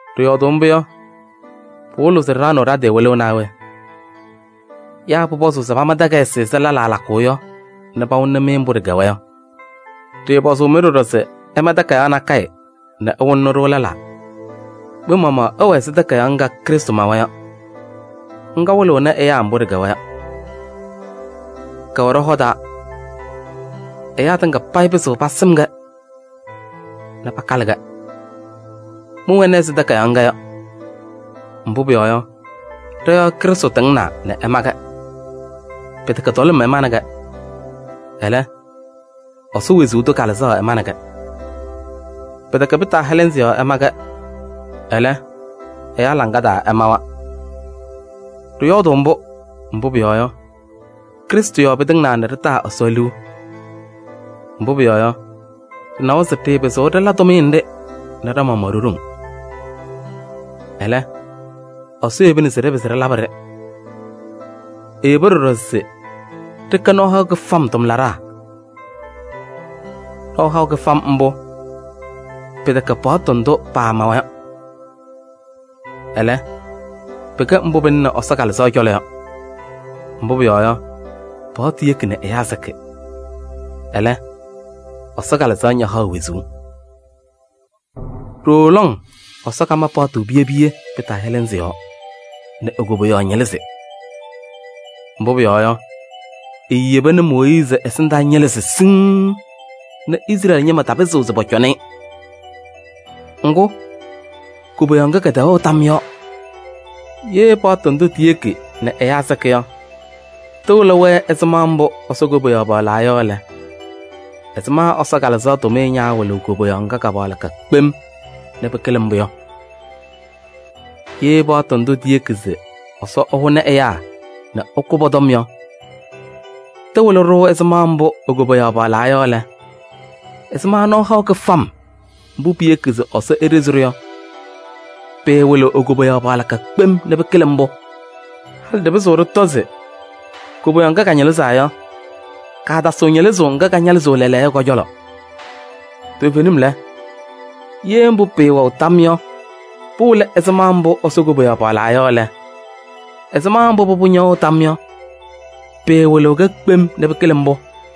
Ɖɩyɔɔdʋʋ mbʋ yɔ, pɩwɩlɩɣ se ɖɩɖaɣnɩɣ ɖa-tɩ wɩlʋʋ naa we? Yaa pʋpɔzʋʋ se pama takayɩsɩ ɛzɩ lɛlaa lakʋʋ yɔ nɛ pawɩlɩnɩ-mɩ mbʋ ɖɩkɛwa yɔ? Ɖɩɩpɔzʋʋ-mɩ ɖɔɖɔ se ɩma takayaɣ nakɛyɛ nɛ ɩwɩlɩnɩ-ɖʋ lɛlaa. Mɩ-maɣmaɣ ɩwɛ ɛzɩ takayaɣ ŋga Krɩstʋ mawa yɔ. Ŋga wɩlɩɣnɩ ɛyaa mbʋ ɖɩkɛnaa yɔ. Kɛwɛ ɖɔ-hɔ taa. Ɛyaa tɩŋa payɩ pɩzɩɣ pasɩm-kɛ nɛ pakalɩ-kɛ. Mɩwɛnɩ ɛzɩ takayaɣ ŋga yɔ. Mbʋ pʋyɔɔ yɔ, ɖɔ-yɔɔ Krɩstʋ tɩŋnaa nɛ ɛma-kɛ. Pɩtɛkɛ tɔlɩm ɛmanɩ-kɛ, ɛlɛ, Ɛsɔ wezuu tʋ Kalɩzaɣ ɛmanɩ-kɛ. Pɩtɛkɛ pɩtaahɛlɛnzɩ yɔɔ ɛma-kɛ, ɛlɛ, ɛyaa laŋa taa ɛmawa. Ɖɩyɔɔdʋʋ mbʋ, mbʋ pʋyɔɔ yɔ, Krɩstʋ yɔɔ pɩtɩŋnaa nɛ ɖɩtaa Ɛsɔ liu. Mbʋ pʋyɔɔ yɔ, ɖɩnawa se ɖɩɩpɩzɩɣ ɖɩla tʋmɩyɛ nɖɩ nɛ ɖa-maɣmaɣ ɖo-ɖoŋ. Ɛlɛ, Ɛsɔ yebina se ɖɩpɩzɩ ɖɩlabɩ-ɖɩ. Eyeba ɖɔɖɔ se ɖɩkɛ nɔɔ haʋ kɩfam tʋmlaɖaa. Nɔɔ haʋ kɩfam mbʋ pɩtɛkɛ paɣtʋ ndʋ paamawa yɔ. Ɛlɛ, pɩkɛ mbʋ pɩlɩnɩ Ɛsɔ Kalɩzaɣ cɔlɔ yɔ. Mbʋ pʋyɔɔ yɔ, paɣtʋ yeki nɛ ɛyaa sɩkɩ. Ɛlɛ, Ɛsɔ Kalɩzaɣ ñahaɣ wezuu. Ɖooo lɔŋ Ɛsɔ kama paɣtʋ piye piye pɩtaahɛlɛnzɩ yɔɔ nɛ e-koboyaɣ ñɩlɩzɩ. Mbʋ pʋyɔɔ yɔ, eeyeba nɛ Mooyiizi ɛsɩndaa ñɩlɩzɩ siŋŋ nɛ Izrɛɛlɩ ñɩma tapɩzɩɣ se pɔcɔnɩ-ɩ. Ŋgʋ, koboyaɣ ŋga kɛtɛwɛɣ tam yɔɔ. Ye paɣtʋ ndʋ tiyeki nɛ ɛyaa sɩkɩ yɔ, tɩwɩlɩ-wɛ ɛzɩma mbʋ Ɛsɔ koboyaɣ paɣlaa yɔ lɛ, ɛzɩma Ɛsɔ Kalɩzaɣ tʋmɩyɛ ñaawɩlɩɣ koboyaɣ ŋga ka-paɣlɩka kpem nɛ pɩkɩlɩ mbʋ yɔ? Ye paɣtʋ ndʋ tiyeki se Ɛsɔ ɛhʋnɩ ɛyaa nɛ ɛkʋ pɔ-tɔm yɔ, tɩwɩlɩ-ɖʋ ɛzɩma mbʋ e-koboyaɣ paɣlaa yɔ lɛ, ɛzɩma nɔɔ haʋ kɩfam mbʋ piyeki se Ɛsɔ eɖezi-ɖʋ yɔ, pɩɩwɩlɩɣ e-koboyaɣ paɣlɩka kpem nɛ pɩkɩlɩ mbʋ? Halɩ ɖɩpɩzɩɣ ɖɩtɔ se koboyaɣ ŋga kaañɩlɩzaa yɔ, kaatasɩɣ ñɩlɩzʋʋ ŋga kañɩlɩzɩɣ lɛɛlɛɛyɔ yɔ kɔ-cɔlɔ. Toovenim lɛ, ye mbʋ pɩɩwɛɣ tam yɔ, pɩwɩlɩ ɛzɩma mbʋ Ɛsɔ koboyaɣ paɣlaa yɔ lɛ, ɛzɩma mbʋ pʋbʋ ñɛwɛɣ tam yɔ, pɩɩwɩlɩɣ-kɛ kpem nɛ pɩkɩlɩ mbʋ?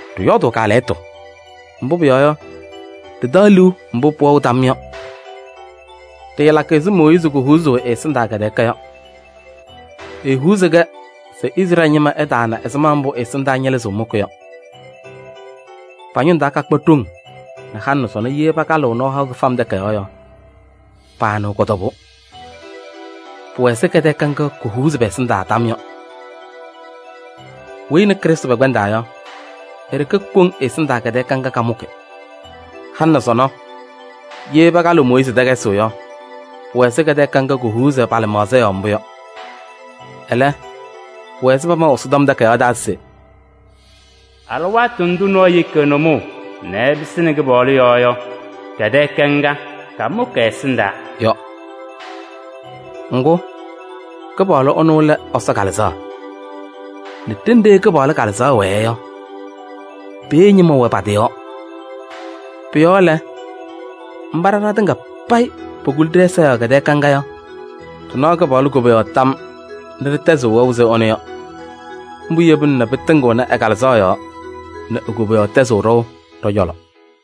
Ɖɩyɔɔdʋʋ kaalɛyɩtʋ, mbʋ pʋyɔɔ yɔ, ɖɩtaɣ liu mbʋ pʋwɛɣ tam yɔ. Ɖɩɩlakɩ ɛzɩ Mooyiizi kohuuzuu ɛ-ɛsɩndaa kɛtɛɛka yɔ. Ehuuzaɣ-kɛ se Izrɛɛlɩ ñɩma ɩtaana ɛzɩma mbʋ ɛ-ɛsɩndaa ñɩlɩzʋʋ mʋkɩ yɔ. Pa-ñʋŋ taa kakpa ɖoŋ nɛ halɩ nɛ sɔnɔ ye pakalɩɣ Nɔɔ Haʋ Kɩbɩm Takayaɣ yɔ, paanɩɣ kɔ-tɔbʋʋ. Pʋwɛ ɛzɩ kɛtɛɛka ŋga kohuuzi pɛ-ɛsɩndaa tam yɔ. Weyi nɛ Krɩstʋ pɛkpɛndaa yɔ, e-ɖeke koŋ ɛ-ɛsɩndaa kɛtɛɛka ŋga kamʋkɩ. Halɩ nɛ sɔnɔ, ye pakalɩɣ Mooyiizi takayɩsɩ yɔ, pʋwɛ ɛzɩ kɛtɛɛka ŋga kohuuzi pa-lɩmaɣza yɔɔ mbʋ yɔ. Ɛlɛ, pʋwɛ ɛzɩ pamaʋ Ɛsɔtɔm Takayaɣ taa se: “Alɩwaatʋ ndʋ nɔɔyʋ yeki ɛ-nʋmɔʋ nɛ ɛpɩsɩnɩ Kɩpaɣlʋ yɔɔ yɔ, kɛtɛɛka ŋga, kamʋkɩ ɛ-ɛsɩndaa” yɔ. Ŋgʋ, Kɩpaɣlʋ ɛnʋ lɛ Ɛsɔ Kalɩzaɣ. Nɛ ɖenɖe Kɩpaɣlʋ Kalɩzaɣ wɛɛ yɔ, peeye ñɩma wɛ pa-tɩ yɔɔ. Pʋ-yɔɔ lɛ, mba ɖa ɖatɩŋa payɩ pokuli ɖɛ-ɛza yɔɔ kɛtɛɛka ŋga yɔ, ɖɩnaɣ Kɩpaɣlʋ koboyaɣ tam nɛ ɖɩtɛzɩɣ wɛʋ ɛzɩ ɛnʋ yɔ. Mbʋ yebina nɛ pɩtɩŋɩɣnɩ ɛ-Kalɩzaɣ yɔɔ nɛ e-koboyaɣ tɛzɩɣ ɖɔʋ ɖɔ-cɔlɔ.